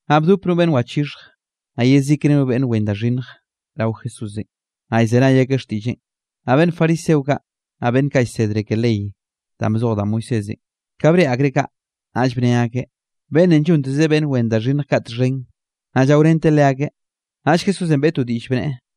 Naꞌ bdop no beꞌnn wachixhj, naꞌ yezikre no beꞌnn wen da xhinnj rao Jesúsenꞌ, naꞌ llzenay akeꞌ xtiꞌlleꞌn. Naꞌ beꞌnn fariseo kaꞌ, naꞌ beꞌnn kaꞌ llsedre ke ley danꞌ bzoj da Moisésenꞌ, ka breꞌe akreꞌ kaꞌ, naꞌll bne akeꞌ: —Beꞌnnenꞌ llontezeꞌ beꞌnn wen da xhinnj kaꞌ txhen, naꞌ llaorenteꞌ leakeꞌ. Naꞌll Jesúsenꞌ beꞌe to diꞌll, bneꞌe: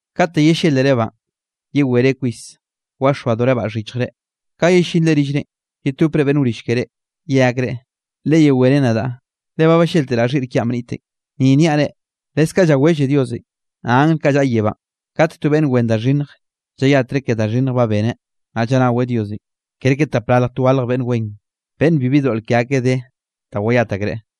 Kate yellélerebaꞌn, yewere kwis waxoadorebaꞌ xhichjre. Ka yellinre rillrenꞌ, yetopre beꞌnn wrill keré, ye akreꞌ: “Leyewé ren nadaꞌ, le ba ballélteraꞌ xhiꞌr kiaꞌn bnitenꞌ.” Ni niaꞌ reꞌ, leskaꞌ llawelle Diosenꞌ, naꞌ angl kaꞌ llaꞌa yebánꞌ, kate to beꞌnn wen da xhinnj llayatreꞌ ke da xhinnj ba beneꞌ, naꞌ llanaweꞌ Diosenꞌ, kerke tapralj twalj beꞌnn wen, beꞌnn bibi doꞌl ke akeꞌ de da wayat akreꞌ.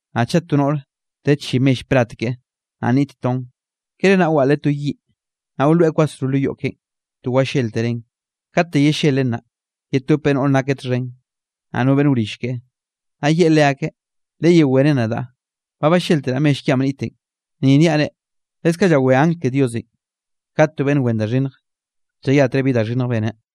’Naꞌ chaꞌ to noꞌr de chi mell plat keꞌe, naꞌ nnit ton, ¿kere naꞌ waꞌleꞌ to yiꞌ, naꞌ wloeꞌ kwasro lo yoꞌ keꞌen to walléltereꞌn? Kate yellelen naꞌ, yetopeꞌ noꞌre nakeꞌ txhen, naꞌ no beꞌnn wrill keꞌe, naꞌ yeꞌe leakeꞌ: “Leyewé ren nadaꞌ, ba ballélteraꞌ mell kiaꞌn bnitenꞌ.” Ni niaꞌ reꞌ, leskaꞌ llawé angl ke Diosenꞌ kate to beꞌnn wen da xhinnj, llayatreꞌ bi da xhinnj beneꞌ.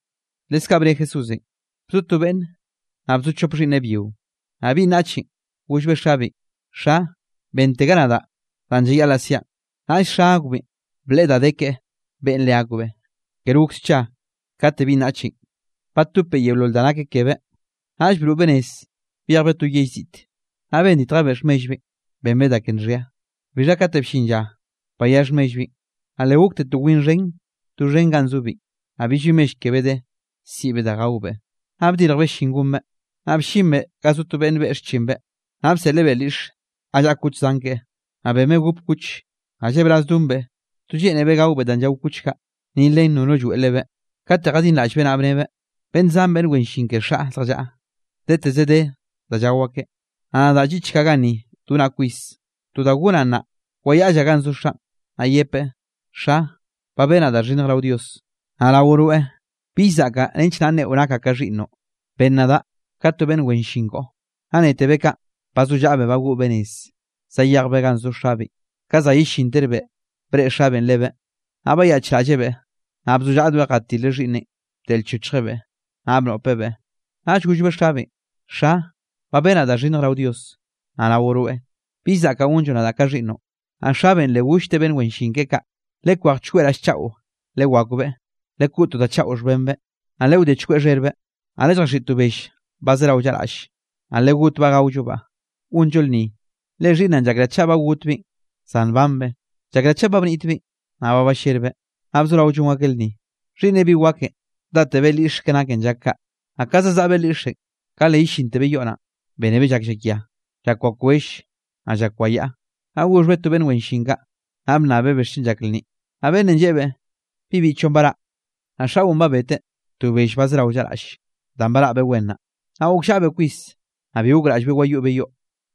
Leskaꞌ bne Jesúsenꞌ: —Bzo to beꞌnn, naꞌ bzo chop xhiꞌnneꞌ byio. Naꞌ binꞌ naꞌchenꞌ gollbeꞌ xabeꞌn: “Xa, benntega nadaꞌ danꞌ llayaꞌlaꞌ siaꞌn.” Naꞌll xa akbeꞌn bleꞌe da de keꞌe beꞌen leakbeꞌ. Ker gok scha kate binꞌ naꞌchenꞌ, batopbeꞌ yeolol da nake kebeꞌ, naꞌll broꞌbeꞌ nez byejbeꞌ to yell ziꞌte. Naꞌ benditjebeꞌ xhmellbeꞌn, benbeꞌ da ke nxhia. Bixha kate bllin lla bayá xhmellbeꞌn, naꞌ le gokte to win xhen doxhen do ganꞌ zobeꞌn. Naꞌ billbi mell kebeꞌ de, siꞌbeꞌ da gaobeꞌ. Naꞌ bdirjbeꞌ llin gonbeꞌ, naꞌ bllinbeꞌ ga zo to beꞌnn beꞌe xchinbeꞌ, naꞌ bseꞌlebeꞌ lyiꞌxe ga llaꞌa kuch zan keꞌe, naꞌ benbeꞌ gop kuch. Naꞌ llebraz donbeꞌ, to lleꞌnebeꞌ gaobeꞌ danꞌ llao kuch kaꞌ, ni len nono lloeꞌ lebeꞌ. Kate jadinraꞌllbeꞌ naꞌ bnebeꞌ: “Beꞌnn zan beꞌnn wen llin ke xaꞌ zjallaꞌa, deteze de da llao akeꞌ, naꞌ nadaꞌ lliꞌchkaꞌ ganni donaꞌ kwis. To da gonaꞌ nnaꞌ, wayaꞌllaꞌ ganꞌ zo xaꞌn, naꞌ yepeꞌ: Xa, ba benaꞌ da xhinnj rao Dios, naꞌ rao rweꞌ. Bill zaꞌkaꞌ nench naꞌ nneꞌo nakaꞌ ka xhiꞌnnoꞌ, ben nadaꞌ ka to beꞌnn wen llin koꞌo.” Naꞌ netebeꞌ kaꞌn, bazollaꞌbeꞌ bagoꞌbeꞌ nez, zayejbeꞌ ganꞌ zo xabeꞌn. ’Ka za yellinterbeꞌ, breꞌe xabeꞌn lebeꞌ, naꞌ bayaꞌchraꞌllebeꞌ, naꞌ bzollaꞌdoeꞌ jatileꞌ xhiꞌnneꞌn bdeꞌlchochjebeꞌ, naꞌ bnoꞌpebeꞌ. Naꞌll gollbeꞌ xabeꞌn: “Xa, ba benaꞌ da xhinnj rao Dios, naꞌ rao rweꞌ, bill zaꞌkaꞌ gonlloꞌ nadaꞌ ka xhiꞌnnoꞌ.” Naꞌ xabeꞌn le gollteꞌ beꞌnn wen llin keꞌe kaꞌ: “Lekwej chkweꞌ raꞌll chaꞌo lewakbeꞌ, lekoꞌ to da chaꞌo xhbenbeꞌ, naꞌ lewdé chkweꞌ xherbeꞌ. Naꞌ lelljaxhiꞌi to bell banꞌ zerao llaꞌraꞌll, naꞌ legotbaꞌ gaollobaꞌ, gonllo lnni. Le xhiꞌnnaꞌn llakraꞌ chaꞌ ba gotbeꞌn, zan nbanbeꞌ; llakraꞌ chaꞌ ba bnitbeꞌn, naꞌ ba ballerbeꞌ.” Naꞌ bzorao llon akeꞌ lnni. ’Xhiꞌnneꞌ bi wakenꞌ, datebeꞌ lyiꞌxe ke naken llak kaꞌ, naꞌ ka zazaꞌbeꞌ lyiꞌxenꞌ, ka le yellintebeꞌ yoꞌ naꞌn, bénebeꞌ llak llakia, llak wakwell, naꞌ llak wayaꞌa. Naꞌ goxhbeꞌ to beꞌnn wen llin kaꞌ, naꞌ bnnabbeꞌ bixchen llak lnni. Naꞌ beꞌnnenꞌ lleꞌebeꞌ: “Bi biꞌchoꞌn baraꞌ, naꞌ xaꞌon ba beteꞌ to bell ba zerao llaꞌraꞌll, danꞌ baraꞌbeꞌ wen naꞌ.” Naꞌ gokllaꞌbeꞌ kwis, naꞌ bi gokraꞌllbeꞌ wayoꞌbeꞌ yoꞌ,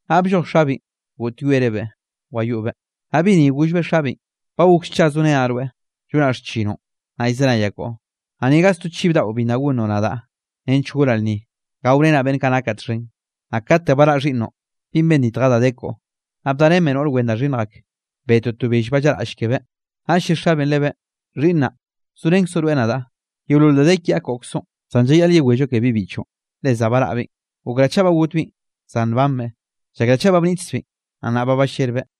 naꞌ blloj xabeꞌn, goꞌtyoerebeꞌ wayoꞌbeꞌ. Naꞌ bi ni gollbeꞌ xabeꞌn: “Ba gok scha zorenaꞌ rweꞌ, llonaꞌ xchinoꞌn, naꞌ llzenayaꞌ koꞌo, naꞌ ni to gaz to chiv daꞌo bi nna gonnoꞌ nadaꞌ, nench gonaꞌ lnni gaorenaꞌ beꞌnn kaꞌ nakaꞌ txhen. Naꞌ kate baraꞌ xhiꞌnnoꞌn binꞌ benditja da de koꞌo, naꞌ bdarenbeꞌ noꞌr wen da xhinnj ak, betteꞌo to bell ba llaꞌraꞌll kebeꞌ.” Naꞌll lle xabeꞌn lebeꞌ: “Xhiꞌnnaꞌ, zorenkzoꞌ rweꞌ nadaꞌ, yeolol da de kiaꞌ koꞌkzoꞌn. Zan llayaꞌl yewello ke bibiꞌchoꞌn, le za baraꞌbeꞌn, gokraꞌ chaꞌ ba gotbeꞌn, zan nbanbeꞌ, llakraꞌ chaꞌ ba bnitkzbeꞌn, naꞌ nnaꞌ ba ballerbeꞌ.”